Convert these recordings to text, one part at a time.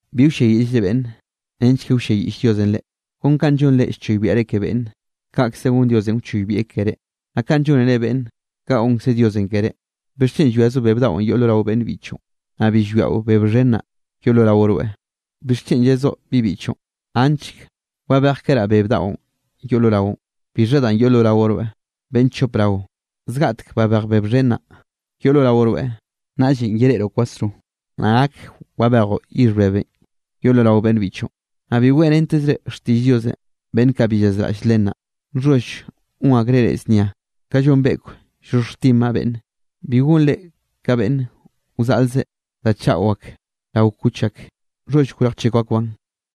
’Bi wlliayiꞌllre beꞌnne, nench ke wlliayiꞌll Diosenꞌ reꞌ. Kon kanꞌ llonre llchoybiaꞌre ke beꞌnne, kaꞌkze gon Diosenꞌ wchoybieꞌ keré. Naꞌ kanꞌ llónere beꞌnne, kaꞌ gonkze Diosenꞌ ke reꞌ. ¿Bixchen llwiazoꞌ beb daꞌon yoꞌ lo rao beꞌnn biꞌchoꞌn, naꞌ bi llwiaꞌo beb xhen naꞌ, yoꞌ lo rao rweꞌ? ¿Bixchen yezoꞌ bibiꞌchoꞌn: “Anchk wabejkeraꞌ beb daꞌon yoꞌ lo raoꞌn?” ¿Bixha danꞌ yoꞌ lo rao rweꞌ? ¡Beꞌnn chop rao! Zgaꞌtek babej beb xhen naꞌ, yoꞌ lo rao rweꞌ, naꞌllenꞌ yereꞌroꞌ kwasro, naꞌ gak wabejoꞌ yixh bebenꞌ yoꞌ lo rao beꞌnn biꞌchoꞌn. ’Naꞌ bi weꞌrentezre xtiꞌll Diosenꞌ beꞌnn kaꞌ bi llazraꞌll len naꞌ, nxholl gon akreꞌ reꞌ znia ka llon beꞌkw wxhoxhjtinbaꞌ beꞌnne. Bi gonre ka beꞌnn wzaꞌlzeꞌ da chaꞌo ak rao kuch ak, nxholl wrejchekw akbaꞌn.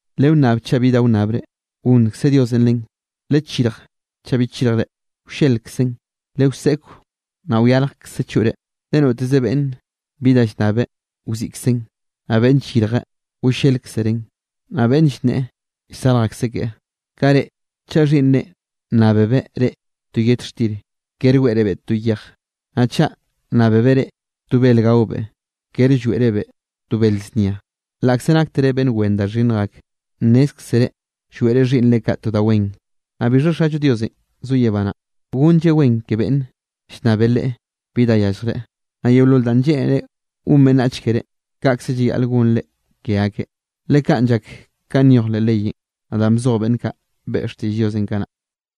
’Lewnnab, chaꞌ bi wnnabre, gonnkze Diosenꞌ len; lechirj, chaꞌ bi chirjre, wllelkzen; lewseꞌkw, naꞌ wyarjkze choꞌre. Le noteze beꞌnne bi da llnnabeꞌ, wziꞌkzeꞌn; naꞌ beꞌnn llyirjeꞌ, wllelkzereꞌn; naꞌ beꞌnn llnneꞌe, llsarj akseꞌ keꞌe. ’Kaꞌ reꞌ, chaꞌ xhiꞌnnre nnábebeꞌ reꞌ to yet xtir, kere weꞌrebeꞌ to yej. Naꞌ chaꞌ nnábebeꞌ reꞌ to bel gaobeꞌ, kere lloeꞌrebeꞌ to bele znia. Laꞌkze naktere beꞌnn wen da xhinnj ak, nnézkzere lloeꞌre xhiꞌnnre kaꞌ to da wen. Naꞌ bixha Xallo Diosenꞌ zo yebá naꞌ, gonlleꞌ wen ke beꞌnn llnnabe Leꞌe bi danꞌ yalljreꞌ. ’Naꞌ yeolol danꞌ lleꞌnere gon beꞌnnach keré, kaꞌkze llayaꞌle gonre ke akeꞌ, le kaꞌn llak ka nyoj leꞌ leyenꞌ, naꞌ danꞌ bzoj beꞌnn kaꞌ beꞌe xtiꞌll Diosenꞌ kanaꞌ.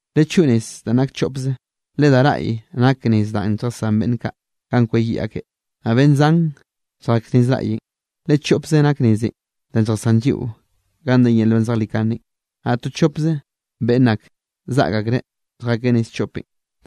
’Lechoꞌo nez danꞌ nak choꞌpze, le da raꞌy nak nez danꞌ lljasán beꞌnn kaꞌ ganꞌ kweyiꞌ akeꞌ. Naꞌ beꞌnn zan lljak nez raꞌyenꞌ. Le choꞌpze nak nezenꞌ danꞌ lljasán lliꞌo ganꞌ de yel nban zejlikanenꞌ, naꞌ to chopze beꞌnn ake zaꞌk akreꞌ lljakeꞌ nez choꞌpenꞌ.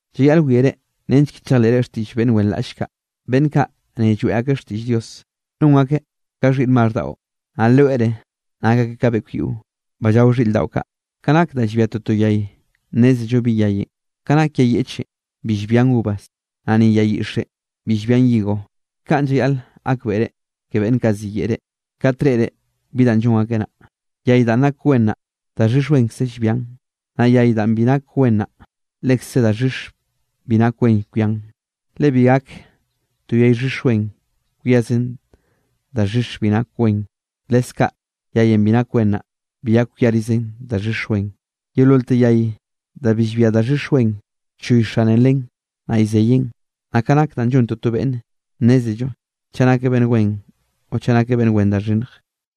’Llayaꞌl wiare nench ke chejleꞌre xtiꞌll beꞌnn wenraꞌll kaꞌ, beꞌnn kaꞌ ne lloeꞌ akeꞌ xtiꞌll Dios, non akeꞌ ka xhiꞌr maxh daꞌo, naꞌ loere nak akeꞌ ka beꞌkw yiꞌo, ba llao xhiꞌr daꞌo kaꞌ. Ka nak da llbia toto yay nnézello bi yayenꞌ. Ka nak yay yeꞌchenꞌ bi llbian uvas, naꞌ ni yay yixenꞌ bi llbian higo. Kaꞌn llayaꞌl gakbeꞌre ke beꞌnn kaꞌ ziyeꞌe reꞌ, kat reꞌre bi danꞌ llon akeꞌ naꞌ. Yay danꞌ nak yay wen naꞌ, daxhix wenkze llbian. Naꞌ yay danꞌ bi nak wen naꞌ, lekze daxhix bi nak wen kwian. Le bi gak to yay xhix wen kwiazen daxhix bi nak wen, leskaꞌ yayenꞌ bi nak wen naꞌ, bi gak kwiarizen daxhix wen. Yeololte yay da bi llbia daxhix wen, llchoy xane len naꞌ llzeyeꞌn. Naꞌ ka nak danꞌ llon toto beꞌnne, nnézello chaꞌ nakeꞌ beꞌnn wen o chaꞌ nakeꞌ beꞌnn wen da xhinnj.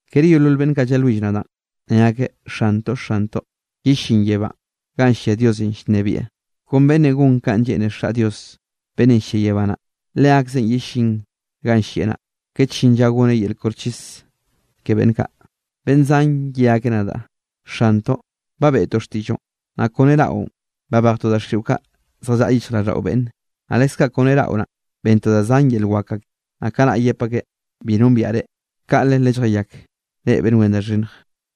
’Kere yeolol beꞌnn kaꞌ llalwill nadaꞌn, ne akeꞌ: “Xantoꞌ, Xantoꞌ”, yellín yebánꞌ ganꞌ llia Diosenꞌ llnebieꞌ. Kon beꞌnne gon kanꞌ lleꞌne Xaꞌ Dios beꞌnne llia yebá naꞌ, leakzeꞌ yellín ganꞌ llieꞌ naꞌ. Kat llin lla gonaꞌ yel koxchis ke beꞌnn kaꞌ, beꞌnn zan ye akeꞌ nadaꞌ: “Xantoꞌ, ba beꞌtoꞌ xtiꞌlloꞌn, naꞌ kone raꞌon, babejtoꞌ daxiꞌo kaꞌ zjallaꞌa yichjraꞌlldaꞌo beꞌnne, naꞌ leskaꞌ kone raꞌo naꞌ, bentoꞌ da zan yel wak ake.” Naꞌ kanaꞌ yep akeꞌ: “Bi nombiaꞌ reꞌ, kaꞌle lelljayak, reꞌ beꞌnn wen da xhinnje.”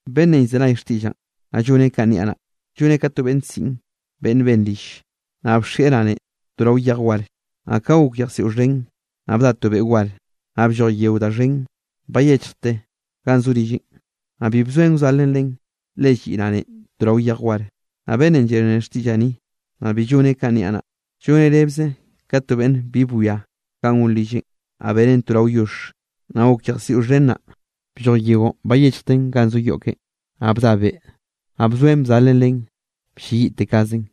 ’Beꞌnnenꞌ llzenay xtiꞌllaꞌn, naꞌ lloneꞌ kanꞌ niaꞌ naꞌ, lloneꞌ ka to ke beꞌnn siꞌn beꞌnn ben rill, naꞌ bxieꞌ ranenꞌ to rao yej war. Naꞌ ka gok yejsiꞌo xhen, naꞌ bda to beꞌ war, naꞌ blloj yeo da xhen bayechjte ganꞌ zo rilleꞌn. Naꞌ bi bzoen wzalen len, le lliꞌ ranen to rao yej war. Naꞌ beꞌnn llenreꞌ xtiꞌllaꞌ ni, naꞌ bi lloneꞌ kanꞌ niaꞌ naꞌ, lloneꞌ rebze ka to beꞌnn bi bwia ganꞌ gon rilleꞌn, naꞌ beneꞌn to rao yoxh. Ka gok yejsiꞌo xhen naꞌ, blloj yeonꞌ bayechjten ganꞌ zo yoꞌ keꞌen, naꞌ bda beꞌ, naꞌ bzoen bzalen len blleyiꞌtekazen.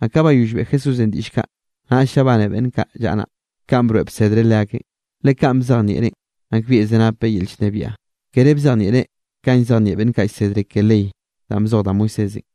Naꞌ ka bayoll beꞌe Jesúsenꞌ diꞌll kaꞌ, naꞌll llabane beꞌnn kaꞌ llaꞌa naꞌ, kanꞌ broeꞌ bsedreꞌ leakeꞌn. Le kanꞌ bzejnieꞌreꞌn, nakbieꞌkze napeꞌ yel llnebiaꞌ, kere bzejnieꞌreꞌ kanꞌ llzejnieꞌ beꞌnn kaꞌ llsedre ke ley danꞌ bzoj da Moisésenꞌ.